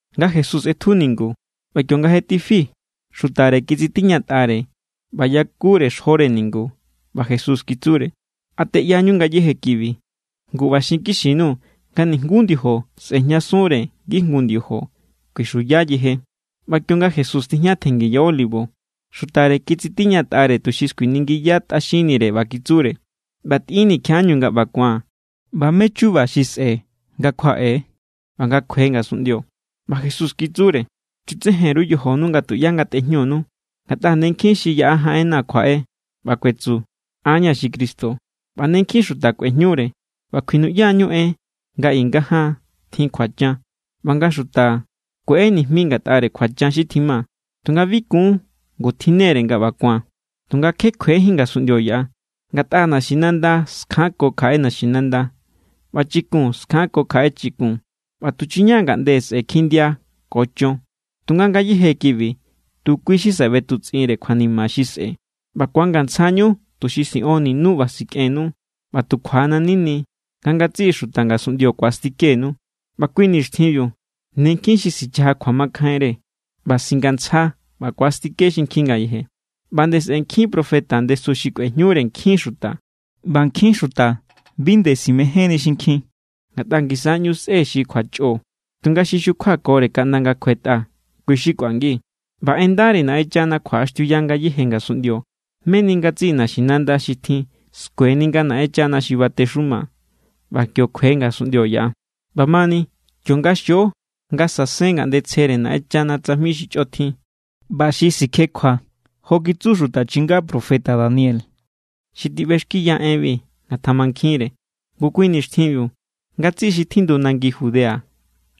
Nga Jesús ꞌetju ningu, ꞌba kionga je tifi, xutare kitsitiñatꞌare ꞌba yakure xjore ningu. ꞌBa Jesús kitsure: —¿A teꞌyañu ngayéje kibi? Ngu ꞌba xinkixi_nuu̱ nga nijnguú ndiojo sꞌe̱jñasunre ngijngu ndiojo. Kuixuya yeje. ꞌBa kionga Jesús tijña tjenngi ya Olivo, xutare kitsitiñatꞌare tuxi skuiningiya tꞌaxinnire ꞌba kitsure: —ꞌBa tꞌinnii̱ kjiaꞌañu nga ꞌba ku̱an ꞌba mé= chuba xi sꞌe̱ nga kjuaꞌe=, ꞌba nga kjue ngasunꞌndio. ꞌBa Jesús kitsure: —Chutsejen_ru yojonu nga tuꞌyá ngatꞌejñunu. Ngatꞌa ne nkjin xi yaꞌa jaꞌenna̱ kjuaꞌe ꞌba kuetsu: “An= ña̱ xi Cristo”, ꞌba ne nkjin xuta kꞌuejñure. ꞌBa kjuinuꞌyañu en nga i nga jaan tjin kjuachan ꞌba nga xuta kueꞌe nijmi ngatꞌare kjuachan xi tjima, tunga bi kun. Ngu tjinne=re nga ꞌba ku̱an, tunga kje kjuejin ngasunꞌndio yaꞌa. Ngatꞌa naxinanda skjanko kjaꞌe naxinanda, ꞌba chikun skjanko kjaꞌe chikun. ꞌBa tuchuña= ngaꞌnde sꞌe̱ kjindia ko chon. Tunga ngayéje kibi tu kui= xi saꞌe ꞌbetutsꞌinre kjuanima xi sꞌe̱. ’ꞌBa ku̱angantsjañu tuxi siꞌonninu ꞌba sikꞌennu, ꞌba tu kjuanna̱= nini nga ngatsiꞌi xuta ngasunꞌndio ku̱astikenu. ꞌBa kui nixtjinbiu ne nkjin xi sichaja kjuamakjainre, ꞌba singantsja ꞌba ku̱astike xinkjin ngayeje. ꞌBa nde sꞌe̱ nkjin profeta ndesu xi kꞌuejñure nkjin xuta. ꞌBa nkjin xuta bi nde simejénni xinkjin, ngatꞌa ngisa= ꞌñu sꞌe xi kjuachꞌo. Tunga xi xukjuakore kaꞌnda nga̱ kjuetꞌa, kui= xi kꞌuangi. ꞌBa en ndare Naꞌenchana kjuaꞌaxtiuya ngayéje ngasunꞌndio, meni ngatsiꞌi naxinanda xi tjin skueni nga Naꞌenchana xi batexuma, ꞌba kio kjue ngasunꞌndio yaꞌa. ’ꞌBamani kionga xio nga sasen ngaꞌnde tsjere Naꞌenchana tsajmi xi chꞌotjin ꞌba xi sikjekjua jo kitsu xuta chinga profeta Daniel (xi tiꞌbexkiya enbi, ngatamankjinre), ngu kui nixtjinbiu, ngatsiꞌi xi tjindu nangi Judea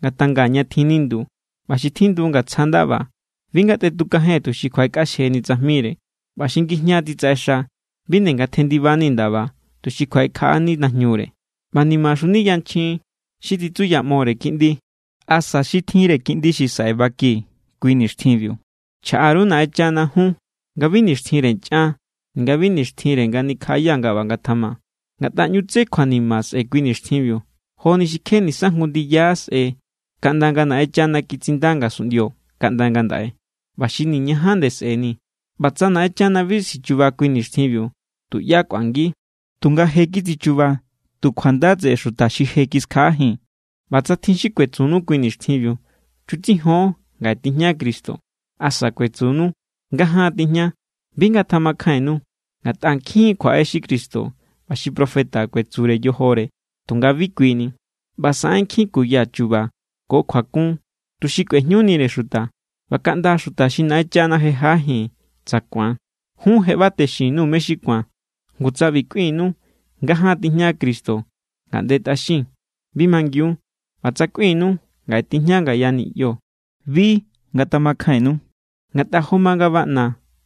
ngatanga ña tjin nindu. ꞌBa xi tjindu ngatsja ndaba, bi ngatꞌetukajen tuxi kjuaꞌekꞌaxjeni tsajmire. ꞌBa xi ngijña titsaꞌexa, bi nde ngatjendibani ndaba tuxi kjuaꞌekjaꞌani najñure. ꞌBa ¡nimaxuni yanchjin xi titsuyaꞌmore kiꞌndi asa xi tjinre kiꞌndi xi saꞌe baki kui nixtjinbiu! Chjaꞌa_ru Naꞌenchana jun nga bi nixtjinre nchꞌan ninga bi nixtjin nga nikjaꞌaya nga ꞌba ngatjama. Ngatꞌa ꞌñu tsé kjuanima sꞌe̱ kui nixtjinbiu joni xi kje nisa jngu ndiyajín sꞌe kaꞌnda nga Naꞌenchana kitsinda ngasunꞌndio kaꞌnda ngandaꞌe, ꞌba xi niñaja nde sꞌe̱ni. ꞌBa tsa Naꞌenchana bi sichuba kui nixtjinbiu, tuꞌyá kꞌuangi. Tunga je kitsichuba tu kjunda tseꞌe xuta xi je kiskjaꞌajin. ’ꞌBa tsa tjin xi kuetsunu kui nixtjinbiu: “Chutsijon, ngaꞌe tijña Cristo”, asa kuetsunu: “Ngajaan tijña”, bi ngatamakjainnu. Ngatꞌa nkjin= kjuaꞌe xi cristo ꞌba xi profeta kuetsure yojore tunga bi kui ni. ꞌBa saꞌen nkjin kuya chu̱ba̱ ko kjuakun tuxi kꞌuejñunire xuta, ꞌba kaꞌnda xuta xi Naꞌenchana je jaꞌajin tsa ku̱an. Jun je ꞌba texintitjun_nuu̱ mé= xi ku̱an. Ngu, tsa ꞌbi kꞌuinu: “Ngajaan tijña Cristo ngaꞌnde tꞌaxin”, bi mangiun. ꞌBa tsa kꞌuinu: “Ngaꞌe tijña ngaya niꞌyo”, bi ngatamakjainnu. Ngatꞌa jo ma nga baꞌna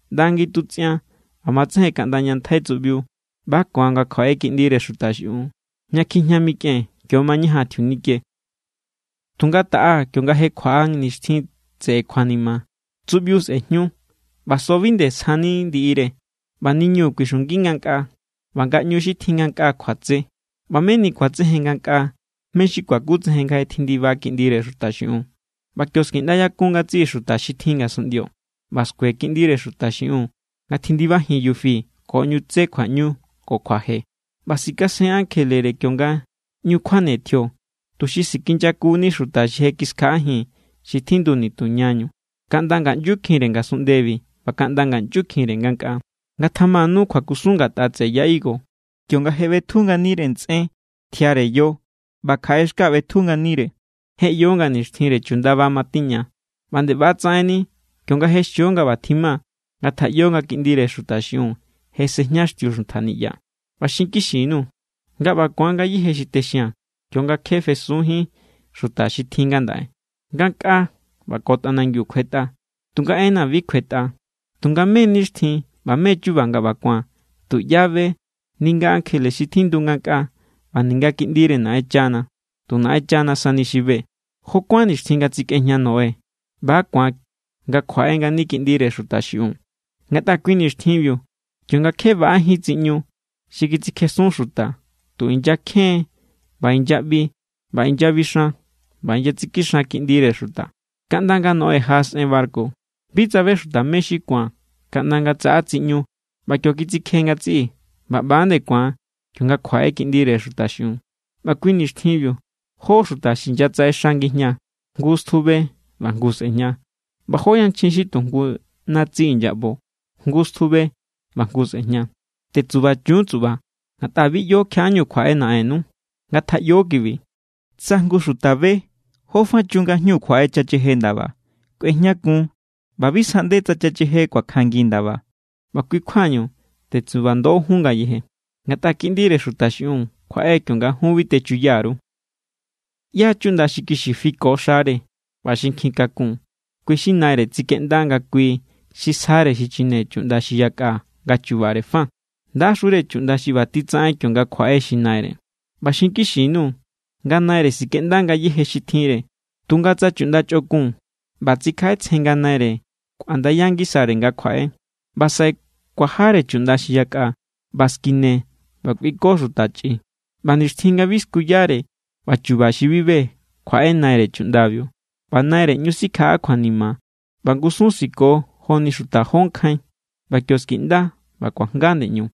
ꞌnda ngitutsꞌian ꞌba matsejen kaꞌnda ña ntjai tsuꞌbiu, ꞌba= ku̱an nga kjuaꞌe Kiꞌndire Xuta xiꞌiun. Ña kjijña mikꞌen, kio= mañajan tjiunike. ’Tunga taꞌa kionga je kjuaꞌa nixtjin tseꞌe kjuanima, tsuꞌbiu sꞌe̱jñu, ꞌba so bi nde sjani ndiꞌire, ꞌba niñu kuixungi ngankꞌaa, ꞌba ngaꞌñu xi tjin ngankꞌaa kjuatse. ꞌBa meni ku̱atsejen ngankꞌaa mé= xi kuakutsejen nga je tjindiba Kiꞌndire Xuta xiꞌiun, ꞌba kio= skiꞌndayakun ngatsiꞌi xuta xi tjin ngasunꞌndio, ꞌba skue Kiꞌndire Xuta xiꞌiun nga tjindibajin yufi ko ꞌñu tsé kjuaꞌñu ko kjuaje. ꞌBa sikasen ankjelere kionga ꞌñu kjuane tjio, tuxi sikinyakuni xuta xi je kiskjaꞌajin xi tjindu nitu ñañu, kaꞌnda ngaꞌnyukjinre ngasunꞌndebi ꞌba kaꞌnda ngaꞌnyukjinre ngankꞌaa. ’Ngatjamanu kjuakusun ngatꞌa tseꞌe ya higo. Kionga je ꞌbetju nganire ntsꞌen tjiare yo ꞌba kjaꞌe xka ꞌbetju nganire, je ꞌyo nga nixtjinre chundaba matiña. ꞌBa nde ꞌba tsaꞌenni kionga je xio nga ꞌba tjima, ngatjaꞌyo nga Kiꞌndire Xuta xiꞌiun je sejñaxtiu xuntja niꞌya. ꞌBa xinkixi_nuu̱ nga ꞌba= ku̱an ngayéje xi texia̱n kionga kje fesunjín xuta xi tjin ngandaꞌe. Ngankꞌaa ꞌba ko tꞌanangiu kjuetꞌa, tunga enna̱ bi kjuetꞌa. ’Tunga mé= nixtjin ꞌba mé= chuba nga ꞌba ku̱an, tuꞌyá be, ninga ankjele xi tjindu ngankꞌaa ꞌba ninga Kiꞌndire Naꞌenchana. Tu Naꞌenchana sani xi be. ’Jó kuán nixtjin nga tsikꞌejña Noé, ꞌba= ku̱an nga kjuaꞌe ngani Kiꞌndire Xuta xiꞌiun. Ngatꞌa kui nixtjinbiu, kionga kje baꞌajín tsiꞌñu xi kitsikjesun xuta, tu inyakjen ꞌba inyaꞌbi ꞌba inyabixan ꞌba inyatsikixan kiꞌndire xuta, kaꞌnda nga Noé jaꞌasꞌen barku. Bi tsabe xuta mé= xi ku̱an kaꞌnda nga tsaꞌa tsiꞌñu ꞌba kio kitsikje ngatsiꞌi. ꞌBa ꞌba=nde ku̱an kionga kjuaꞌe Kiꞌndire Xuta xiꞌiun. ꞌBa kui nixtjinbiu jó xuta xi inyatsaꞌexa ngijña, jngu stjube ꞌba jngu sꞌe̱jña. ꞌBa jó yanchjin xi tu jngu natsi inyaꞌbo, jngu stjube ꞌba jngu sꞌe̱jña. ’Tetsubachun tsuꞌba, ngatꞌa bi ꞌyo kjiaꞌañu kjuaꞌe Naꞌennu. Ngatjaꞌyo kibi: Tsa jngu xuta be jófa chun nga jñu kjuaꞌe chacheje ndaba, kꞌuejñakun ꞌba bi sjaꞌnde tsa chacheje kuakjangi ndaba. ꞌBa kui kjuañu, tetsubando jun ngayeje, ngatꞌa Kiꞌndire Xuta xiꞌiun kjuaꞌe kionga jun bi techuya_ru. ’¿ꞌYá= chuꞌnda xi kixi fiko xare ꞌba xi nkjikakun, kui= xi naire kitsikeꞌnda nga kui xi sjare xichine chuꞌnda xi yakꞌa nga chubare fa? ¡Ndaxure chuꞌnda xi ꞌba titsaꞌen kionga kjuaꞌe xi naire! ꞌBa xinkixi_nuu̱ nga naire sikꞌenda ngayéje xi tjinre. Tunga tsa chuꞌnda chꞌokun, ꞌba tsikjaꞌetsjen nga naire kꞌuandaya ngisare nga kjuaꞌe, ꞌba saꞌe kuajare chuꞌnda xi yakꞌa, ꞌba skine ꞌba kꞌuiko xuta chꞌi; ꞌba nixtjin nga bi skuyare ꞌba chu̱ba̱ xi bi be, kjuaꞌe naire chuꞌndabiu. ꞌBa naire ꞌñu sikjaꞌa kjuanima ꞌba ngusun siko joni xuta jó nkjain. ꞌBa kio skiꞌnda ꞌba kuajnga ndeꞌñu.